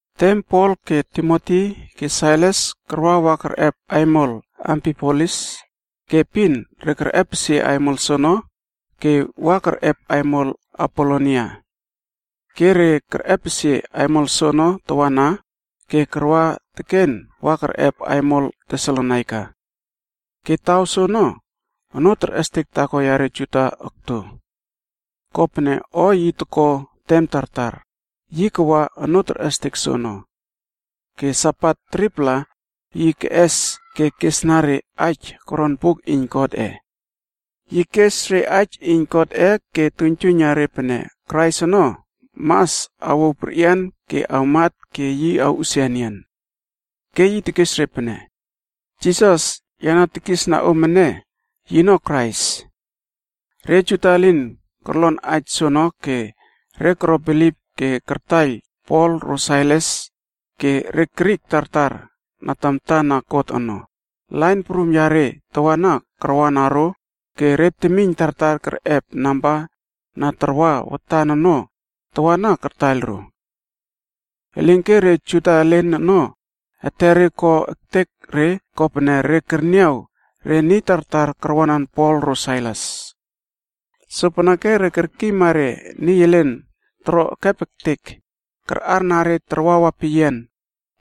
Tem Pol ke Timoti ke Sailas karwa wa kerꞌep aimol Amfipolis ke epin re kerꞌepesie aimol soono ke wa kerꞌep aimol Apolonia. Ke re kerꞌepesie aimol soono tawana ke karwa teken wa kerꞌep aimol Tesalonaika. Ke taw soono, onoo terꞌestek taako yare Juda okto. Kopene o yi toko tem tartar, yi kawa onoo terꞌestek soono. Ke Sabat 3-pla yi keꞌes ke kesna re aij koron buk iyn Godꞌe. Yi kes re aij iyn Godꞌe ke tuiynjuiyna re pene Krais ono mas awouw perꞌian ke awmat ke yi awꞌusia enian. Ke yi tekes re pene, “Jisas, ya na tekisna om ene, yino Krais.” Re Juda elen korlon aij soono ke re koro bilip ke kartaiyl Pol ro Sailas, ke re Grik tartar na tamta na God ono, lain prum yare tawana karwana ro ke re temiyn tartar kerꞌep namba na tarwa watan ono tawana kartaiyl ro. Elinke re Juda elen ono etere ko ektek re kopene re kerniaw re niy tartar karwanan Pol ro Sailas. Sopeneke re kerkiyma re niy elen toro ekep ektek karꞌarna re tarwawa peyian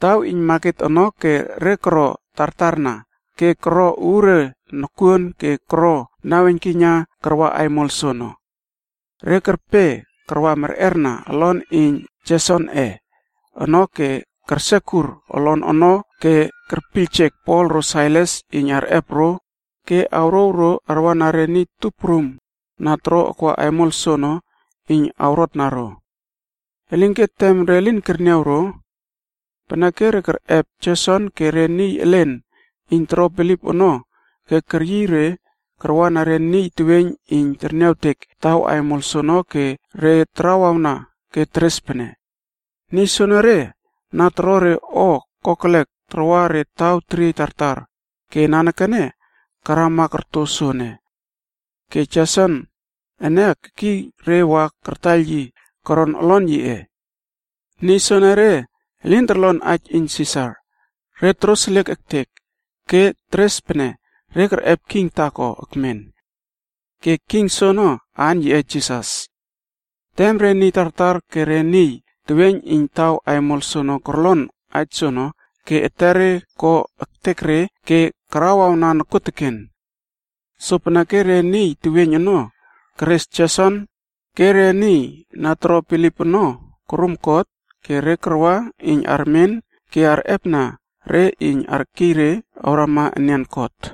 taw iyn maket ono ke re koro tartarna ke koro uure nokuon ke koro naweiynkiyna karwa aimol soono. Re kerpe karwa merꞌerna olon iyn Jesonꞌe ono ke kersekur olon ono ke kerpiyljek Pol ro Sailas iyn arꞌep ro ke awrouw ro arwana re niy tup prum na toro akwa aimol soono iyn re awrotna ro. Elinke tem re lin kerniaw ro. Peneke re kerꞌep Jeson ke re niy elen iyn toro bilip ono ke keryiy re karwana re niy teweiyn iyn terniawtek taw aimol soono ke re tarawawna ke teres pene, “Niy soenere na toro re o kokelek tarwa re taw teriey tartar ke nanekene karama korto soene. Ke Jeson ene kekiy re wa kartaiyl yi koron olon yiꞌe. Niy soenere elin torlon aij iyn Sisar, re toroseliek ektek, ke teres pene re kerꞌep king taako ekmen. Ke king soono aan yiꞌe Jisas.” Tem re niy tartar ke re niy teweiyn iyn taw aimol soono korlon aij soono ke etere ko ektek re ke karawawna nokuoteken. Sopeneke re niy teweiyn ono keres Jeson ke re niy na toro bilip ono korum kot ke re karwa iyn armen ke arꞌepna re iyn arkiy re awrama enian kot.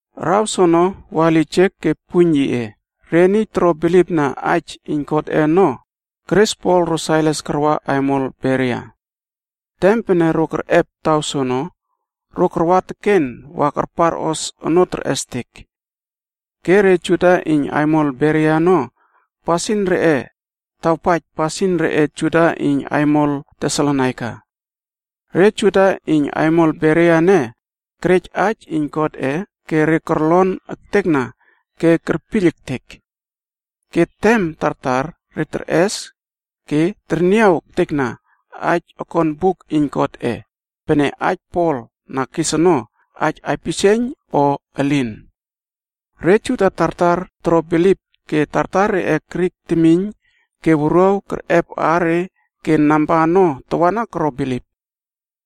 Araw soono wa lijek ke puiyn yiꞌe, re niy toro bilipna aij iyn Godꞌe ono keres Pol ro Sailas karwa aimol Beria. Tem pene ro kerꞌep taw soono, ro karwa teken wa karparꞌos onoo terꞌestek. Ke re Juda iyn aimol Beria ono pasin reꞌe tawpaij pasin reꞌe Juda iyn aimol Tesalonaika. Re Juda iyn aimol Beria ene kerej aij iyn Godꞌe ke re korlon ektekna ke kerpiyl ektek. Ke tem tartar re terꞌes ke terniaw ektekna aij okon buk iyn Godꞌe, pene aij Pol na tekes ono aij aipisieiyn o elin. Re Juda tartar koro bilip ke tartar reꞌe Grik temiyn ke wuruaw kerꞌep aare ke namba ono tawana koro bilip.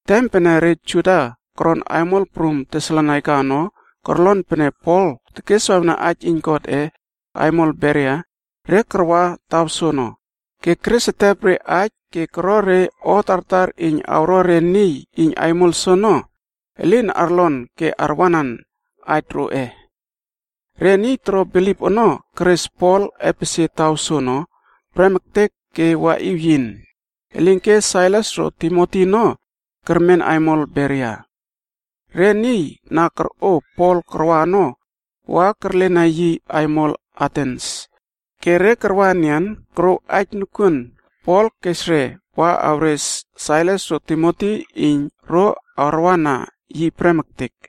Tem pene re Juda koron aimol prum Tesalonaika ono korlon pene Pol tekeswawna aij iyn Godꞌe aimol Beria, re karwa taw soono, ke keres etep re aij ke koro re o tartar iyn awro re niy iyn aimol soono elin arlon ke arwanan aij roꞌe. Re niy toro bilip ono keres Pol epesie taw soono prem ektek ke waꞌiw yin, elinke Sailas ro Timoti ono kermen aimol Beria. Re niy na korꞌo Pol karwa ono, wa kerlena yi aimol Atens, ke re karwa enian korouw aij nokuon Pol kes re wa awres Sailas ro Timoti iyn ro arwana yi prem ektek.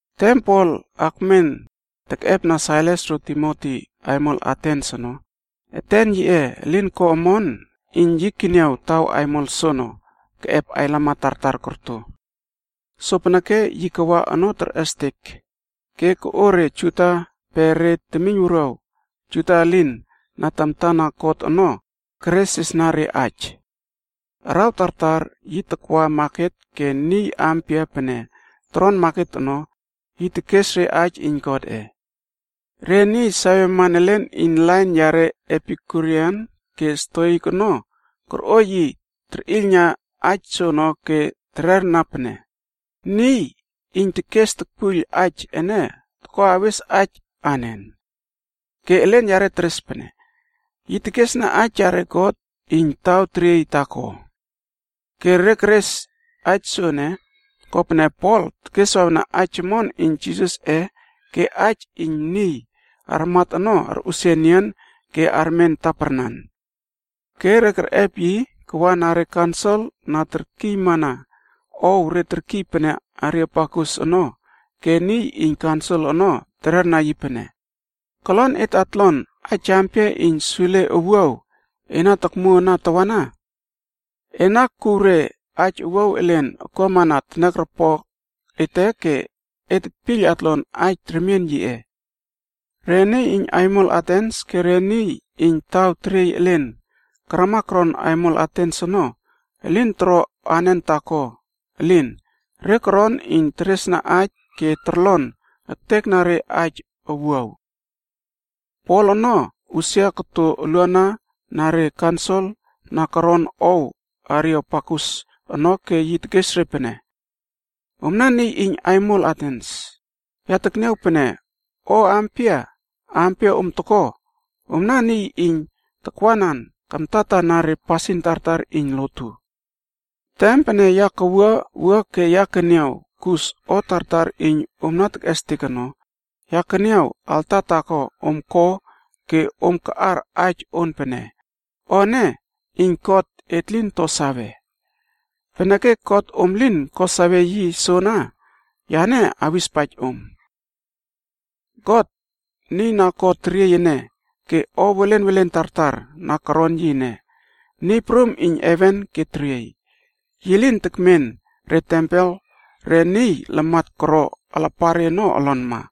Tem Pol akmen tekꞌepna Sailas ro Timoti aimol Atens ono, eten yiꞌe elin ko omon iyn yi keniaw taw aimol soono keꞌep ailamat tartar korto. Sopeneke yi kawa onoo terꞌestek ke koꞌo re Juda pe re temiynwuruaw Juda elin na tamta na God ono keresresna re aij. Araw tartar yi takwa maket ke niy ampia pene toron maket ono, yi tekes re aij iyn Godꞌe. Re niy saweman elen iyn lain yare Epikuriana ke Stoikb ono torꞌo yi terꞌiylna aij soono ke tererna pene, “Niy iyn tekes tokpuiyl aij ene toko awes aij anen?” Ke elen yare teres pene, “Yi tekesna aij yare god iyn taw teriey taako.” Re keres aij soene, kopene Pol tekeswawna aij omon iyn Jisasꞌe ke aij iyn niy armat ono arꞌusia enian ke armen taparnanc. Ke re kerꞌep yi kawa na re kaunsil na terkiymana ow re terkiy pene Areopagus ono ke niy iyn kaunsil ono tererna yi pene, “Kolon et atlon aij ampia iyn sule owuaw e na tokmuo ana tawana? Ena kuw re aij owuaw elen akuamana teniaropok ete ke et tetpiyl atlon aij remien yiꞌe.” Re niy iyn aimol Atens ke re niy iyn taw teriey elen karama koron aimol Atens ono elin toro anen taako elin, re koron iyn teresna aij ke torlon ektekna re aij owuaw. Pol ono usia koto uluana na re kaunsil na koron ow Areopagus ono ke yi tekes re pene, “Omna niy iyn aimol Atens, ya tekniaw pene o ampia, ampia om toko, omna niy iyn takwanan kamtatana re pasin tartar iyn lotu. Tem pene ya kawua wua ke ya keniaw kus o tartar iyn om na tekꞌestek ono, ya keniaw alta taako om ko ke om kaꞌar aij on pene: ‘O ene iyn God et lin to save.’ Peneke God om lin ko sawe yi soana, yane awispaij om. “God, Niy na ko teriey ene, ke o welen welen tartar na koron yi ene, Niy Prum iyn heven ke teriey. Yi lin tekmen re tempel re niy lamat koro alapare ono olonma.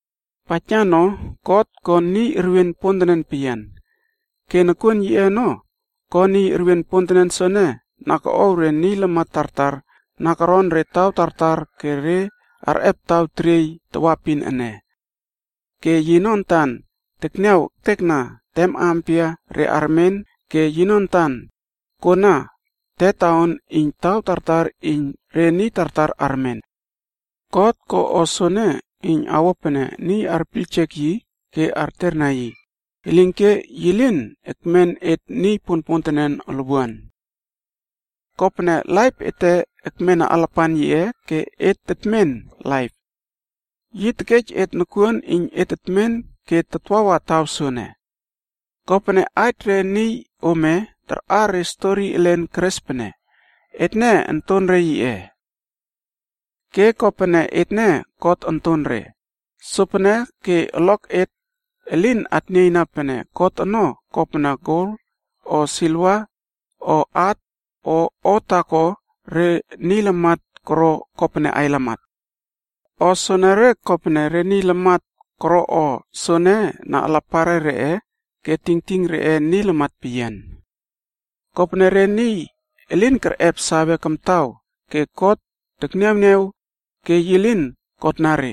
Paijna no, God ko niy erwien pontenen peyian, ke nokuon yiꞌe ono ko niy erwien pontenen soene na koꞌow re niy lamat tartar na koron re taw tartar ke re arꞌep taw teriey tawaepin ene. Ke yino antan tekniaw ektekna tem ampia re armen ke yino antan kona tetaon iyn taw tartar iyn re niy tartar armen. God ko o soene iyn awo pene niy arpiyljek yi ke arterna yi, elinke yi lin ekmen et niy ponpontenen olwuan. “ ‘Kopene laip ete ekmena alapan yiꞌe ke et tetmen laip. Yi tekej et nokuon iyn et tetmen ke tatwawa taw soene.’ Kopene aij re niy ome tarꞌar re stori elen keres pene, ‘Etne ontonre yiꞌe.’ “Ke kopene etne God ontonre, sopene ke olok et elin atnieiyna pene God ono kopene gol, o siliva, o at, o o taako re niy lamat koro kopene ailamat. O soenere kopene re niy lamat koro o soene na alapare reꞌe ke tingting reꞌe niy lamat peyian. Kopene re niy elin kerꞌep sawe kamtaw ke God tekniawniaw ke yi lin kotna re,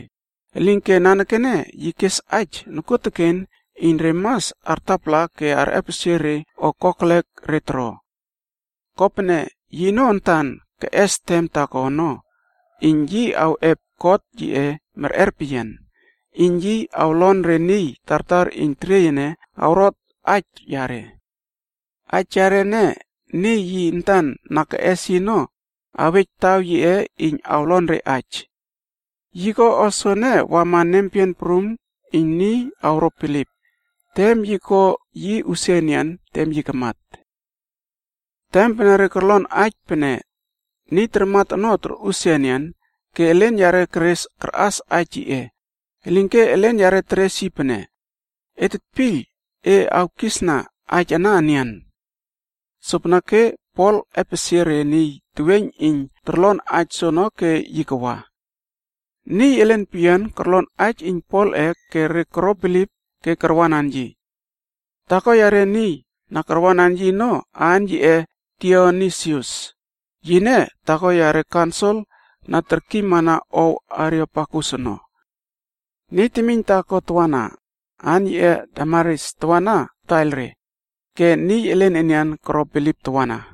elinke nanekene yi kes aij nokuoteken iyn re mas artapala ke arꞌepesie re o kokelek re toro. Kopene yino antan keꞌes tem taako ono iyn yi awꞌep kot yiꞌe merꞌer peyian, iyn yi awlon re niy tartar iyn teriey ene awrot aij yare. Aij yare ene, niy yi antan na keꞌes yi ono awej taw yiꞌe iyn awlon re aij. Yi ko o soene wama nempeyian prum iyn niy awro bilip, tem yi ko yi usia enian tem yi kamat.” Tem pene re korlon aij pene niy tarmat ono torꞌusia enian, ke elen yare keres karꞌas aij yiꞌe, elinke elen yare teres yi pene, “Et tetpiyl e awkisna aij ana enian.” Sopeneke Pol epesie re niy teweiyn iyn torlon aij soono ke yi kawa. Niy elen peyian korlon aij iyn Polꞌe ke re koro bilip ke karwanan yi. Taako yare niy na karwanan yi ono aan yiꞌe Dionisius, yine taako yare kaunsil na terkiymana ow Areopagus ono. Niy temiyn taako tawana, aan yiꞌe Damaris tawana kataiyl re. Ke niy elen enian koro bilip tawana.